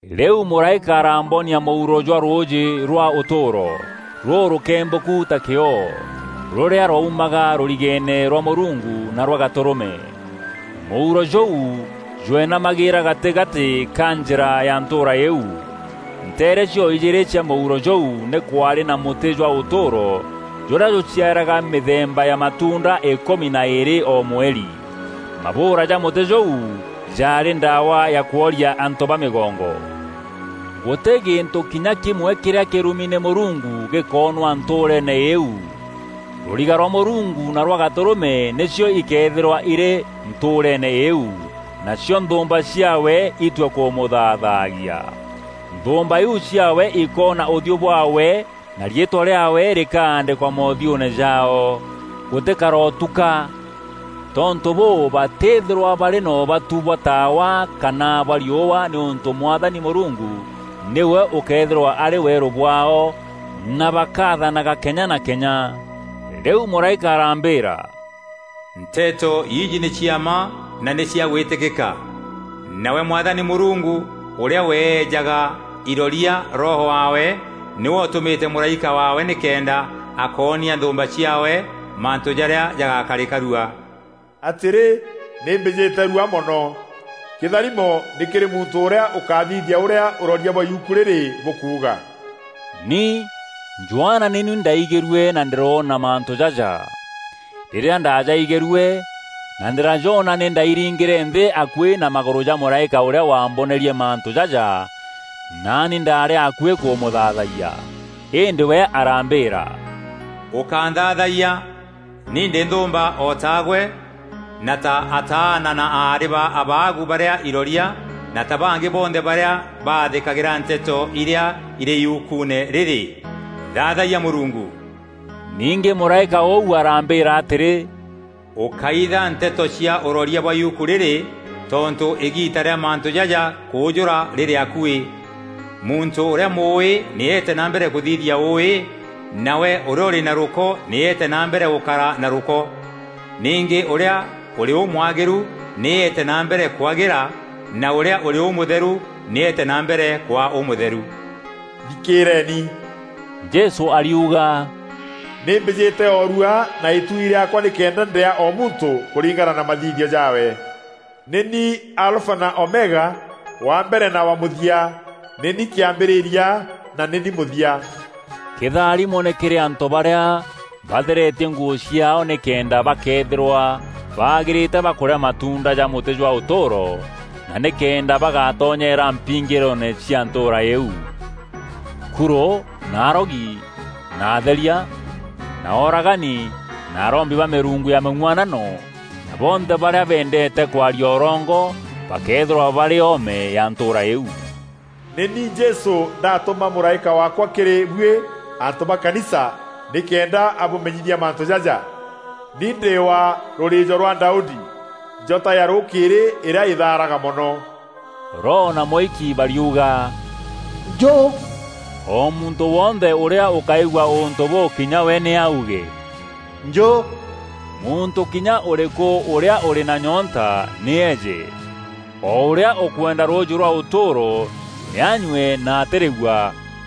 Rîu mûraîka arambonia mûuro jwa rûûjî rwa ûtûûro, rûrûkembûku ta kîoo, rûrîa rwaumaga rûrigeene rwa Mûrungu na rwa Gatûrûme. Mûuro jûu jwenamagîîra gatîgatî ka njîra ya ntûûra îîu. Nteere cio-ijîîrî cia mûuro jûu nî kwaarî na mûtî jwa ûtûûro jûrîa jûciaraga mîthemba ya matuunda îkûmi na îîrî o mweri. Mabûûra ja mûtî jûu jaarî ndawa ya kworia antû ba mîgongo. Gûtî gîntû kinya kîmwe kîrîa kîrumi nî Mûrungu gîkoonwa ntûûreene îîu. Rûriga rwa Mûrungu na rwa Gatûrûme nîcio ikeethîrwa irî ntûûreene îîu, nacio nthûûmba ciaawe itue kûmûthaathagia. Nthûûmba îîu ciaawe ikoona ûthiû bwaawe na riîtwa rîaawe rîkaandîkwa moothiûûne jaao. Gûtîkarotuka. Tontû bûû batîthîrwa barî na ûbatu bwa taawa kana bwa riûa nîûntû Mwathani Mûrungu nîwe ûkeethîrwa arî weerû bwaao na bakathanaga kenya na kenya. Rîu mûraîka arambîîra, “Nteto iji nî cia mma na nî cia gwîtîkîka. Nawe Mwathani Mûrungu, ûrîa weejaga iroria Roho waawe nîwe ûtûmîte mûraîka waawe nîkenda akoonia nthûûmba ciaawe mantû jarîa jagakarîka rua.” “Atîrî! Nî mbîjîte rua mono. Kîtharimo nî kîrî muntû ûrîa ûkathithia ûrîa ûroria bwa yuku rîrî bûkuuga!” Ni, Johana nî ni ndaigîrue na ndîroona mantû jaja. Rîrîa ndajaigîrue na ndîrajoona nî ndairingîre nthî akuî na magûrû ja mûraîka ûrîa wambonerie mantû jaja, naani ndaarî akuî kûmûthaathayia. Îndî we arambîîra, “Ûkánthaathayia! Ni ndî nthûûmba o taagwe na ta ataana na aarî ba abaagu barîa iroria na ta bangî bonthe barîa bathîkagîra nteto irîa irî yukuune rîrî. Thaathayia Mûrungu!” Ningî mûraîka ûu arambîîra atîrî, “Ûkáitha nteto cia ûroria bwa yuku rîrî tontû îgiita rîa mantû jaja kûûjûra rîrî akuî. Muntû ûrîa mûûî nî eete na mbere kûthithia ûûî, nawe ûrîa ûrî na rûko nî eete na mbere gûkara na rûko. Ningî ûrîa ûrî ûmwagîru nî eete na mbere kwagîra, na ûrîa ûrî ûmûtheru, nî eete na mbere kwaa ûmûtheru.” “Thikîîreni!” Jesû ariuga, “Nî mbîjîte o rua na îtuui rîaakwa nîkenda ndîaa o muntû kûringana na mathithio jaawe. Nî ni Alfa na Omega, wa mbere na wa mûthia, nî ni kîambîrîria na nî ni mûthia.” Kîtharimo nî kîrî antû barîa batheretie nguû ciaao nîkenda bakeethîrwa bagîrîte ba kûrîa matuunda ja mûtî jwa ûtûûro na nîkenda bagatonyeera mpingîroone cia ntûûra îîu. Kurû na arogi na atheria na ooragani na arombi ba mîrungu ya mîng'uanano na bonthe barîa bendeete kwaria ûrongo, bakeethîrwa barî oome ya ntûûra îîu. “Nî ni Jesû ndatûma mûraîka waakwa kîrî buî antû ba kanisa nîkenda abûmenyithia mantû jaja. Ni ndî wa rûrîîjo rwa Daudi, njota ya rûkîîrî îrîa îthaaraga mono.” Roho na Mûiki bariuga, “Njû!” O muntû wonthe ûrîa ûkaigua ûntû bûu kinya we nî auge, “Njû!” Muntû kinya ûrîkû ûrîa ûrî na nyoonta nî eeje; o ûrîa ûkwenda rûûjî rwa ûtûûro nî anyue na atîrîua.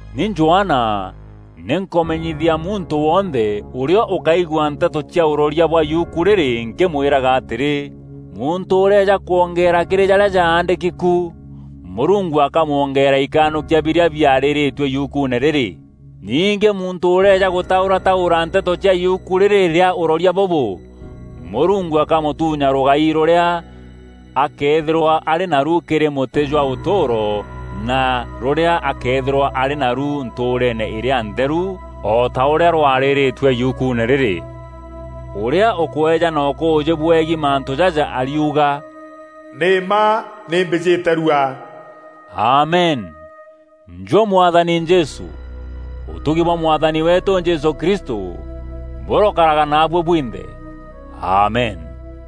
Ni Johana nî nkûmenyithia muntû wonthe ûrîa ûkaigua nteto cia ûroria bwa yuku rîrî nkîmwîraga atîrî: Muntû ûreeja kwongeera kîrî jarîa jaandîki ku, Mûrungu akamwongeera ikanûkia birîa biarîrîîtue yukuune rîrî. Ningî muntû ûreeja gûtaûrataûra nteto cia yuku rîrî rîa ûroria bûbû, Mûrungu akamûtuunya rûgai rûrîa akeethîrwa arî naru kîrî mûtî jwa ûtûûro na rûrîa akeethîrwa arî naru ntûûreene îrîa ntheru, o ta ûrîa rwarîrîîtue yukuune rîrî. Ûrîa ûkweejana ûkûûjî bwegiî mantû jaja ariuga, “Nî mma nî mbîjîte rua!” Amen. Njû Mwathani Jesû! Ûtugi bwa Mwathani weetû Jesû Kristû bûrokaraga naabuî bwinthe. Amen.